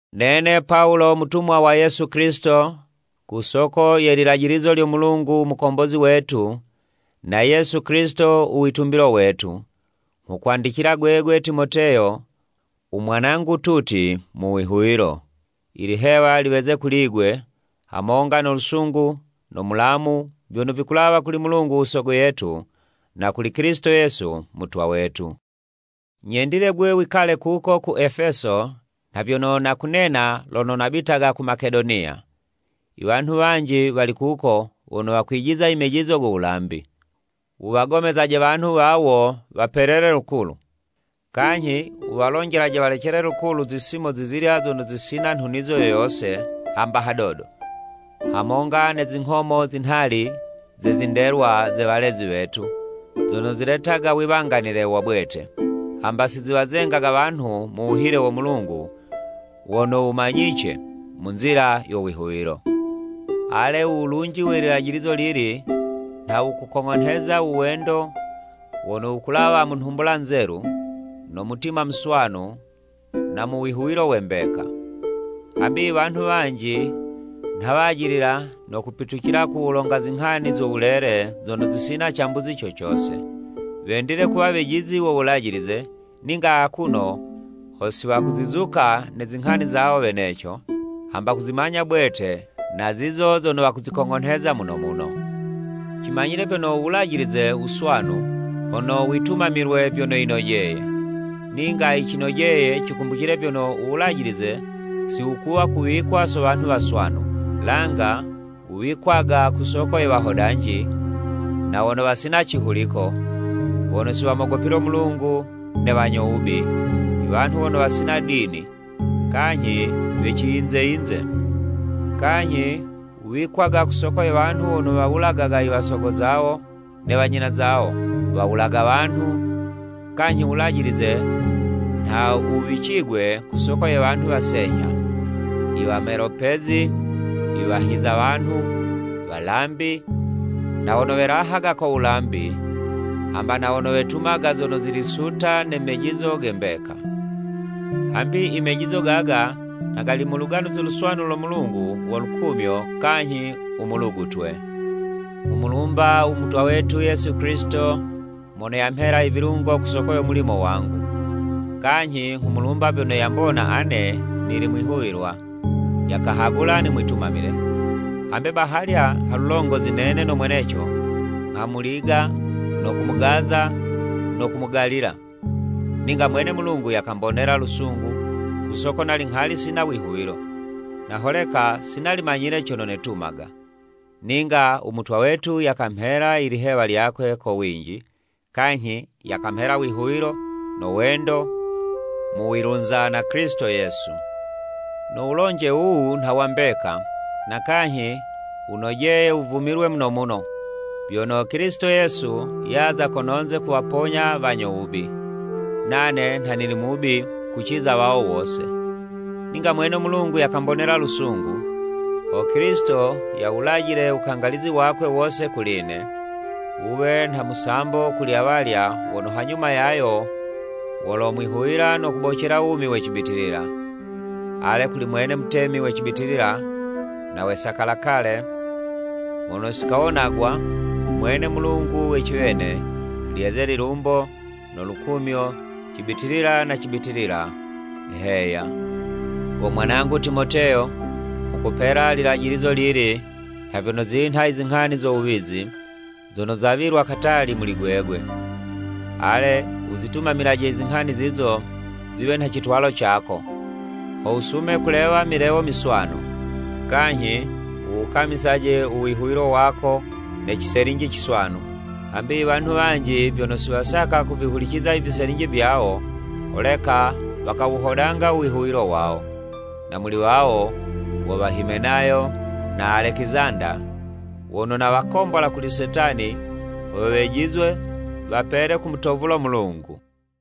Nene Pawulo mutumwa wa Yesu Kilisito ku soko ye lilajilizo lyo Mulungu u Mukombozi wetu na Yesu Kilisito u witumbilo wetu, nghukwandicila gwegwe Timoteyo umwanangu tuti mu wihuwilo. Ilihewa liweze kuli'gwe, hamonga no lusungu no mulamu vyono vikulawa kuli Mulungu u Sogo yetu na kuli Kilisito Yesu Mutwa wetu. Nyendile 'gwe wikale kuko ku Efeso, nha vyono nakunena lono nabitaga ku Makedoniya. Iwanhu wanji wali kuko wono wakwijiza imejizo go wulambi. Wuwagomezaje wanhu wawo wapelele lukulu. Kanyhi wuwalonjelaje walecele lukulu zisimo zizilya zono zisina nhunizo yo yose hamba hadodo, hamonga ne zinghomo zinhali ze zindelwa ze walezi wetu, zono ziletaga wiwanganile wa bwete, hamba siziwazengaga wanhu mu wuhile wo Mulungu wono wumanyice mu nzila yo wihuwilo. Ale u wulunji we lilajilizo lili, nha wukukong'onheza uwendo wono wukulawa mu nhumbula nzelu, no mutima muswanu, na mu wihuwilo we mbeka. Hambi iwanhu wanji nha wajilila no kupitucila ku wulonga zinghani zo wulele zono zisina cambuzi co cose. Wendile kuwa wejizi wo Wulajilize, ninga akuno ho si wakuzizuka ne zinghani zawo weneco, hamba kuzimanya bwete na zizo zono wakuzikong'onheza muno muno. Cimanyile vyono u wulajilize wuswanu, hono witumamilwe vyono yinojeye. Ninga yicinojeye cikumbucile vyono u wulajilize si wukuwa kuwikwa so wanhu waswanu, langa wuwikwaga ku soko ye wahodanji na wono wasina cihuliko, wono siwamogopile u Mulungu ne wanyo wubi, iwanhu wono wasina dini, kanyhi we ciyinze yinze. Kanyhi wuwikwaga ku soko ye wanhu wono wawulagaga i wasogo zawo ne wanyina zawo, wawulaga wanhu, kanyhi wulajilize nha wuwicigwe ku soko ye wanhu wasenyha, i wamelopezi, i wahiza wanhu, walambi, na wono welahaga ko wulambi, hamba na wono wetumaga zono zili suta ne mejizo ge mbeka. Hambi imejizo gaga nha gali mu Luganuzi Luswanu lo Mulungu wo lukumyo kanyhi u mulugutwe. Nghumulumba u Mutwa wetu Yesu Kilisito mono yamhela i vilungo ku soko yo mulimo wangu. Kanyhi nghumulumba vyono yambona ane nili mwihuwilwa, yakahagula nimwitumamile, hambe bahalya halulongozi nene no mweneco nghamuliga no kumugaza no kumugalila. Ninga mwene Mulungu yakambonela lusungu, ku soko nali nghali sina wihuwilo, na holeka si nali manyile cono netumaga. Ninga u Mutwa wetu yakamhela i lihewa lyakwe ko winji, kanyhi yakamhela wihuwilo no wendo mu wilunza na Kilisito Yesu. No wulonje wuwu nha wa mbeka, na kanyhi wunojeye wuvumilwe muno muno, vyono Kilisito Yesu yaza kononze kuwaponya wanyo wubi. Nane nha nili mubi kuciza wawo wose. Ninga mwene Mulungu yakambonela lusungu, ho Kilisito yawulajile wukangalizi wakwe wose kuli'ne, wuwe nha musambo kuli awalya wono hanyuma yayo wolomwihuwila no kubocela wumi we cibitilila. Ale, kuli mwene Mutemi we cibitilila na we sakalakale, mono sikawonagwa, umwene Mulungu we ciwene, lyeze lilumbo no lukumyo cibitilila na cibitilila! Heya. Go mwanangu Timoteyo, nghukupela lilajilizo lili, nha vyono zinha i zinghani zo wuwizi, zono zawilwa katali muli gwegwe. Ale wuzitumamilaje i zinghani zizo ziwe nha citwalo cako, ho wusume kulewa milewo miswanu, kanyhi wuwukamisaje u wihuwilo wako ne ciselinji ciswanu. Hambi iwanhu wanji vyono si wasaka kuvihuliciza i viselinji vyawo, holeka wakawuhodanga u wihuwilo wawo. Na muli wawo, wo wa Himenayo na Alekizanda, wono nawakombola kuli Setani, ho wejizwe wapele kumutovula u Mulungu.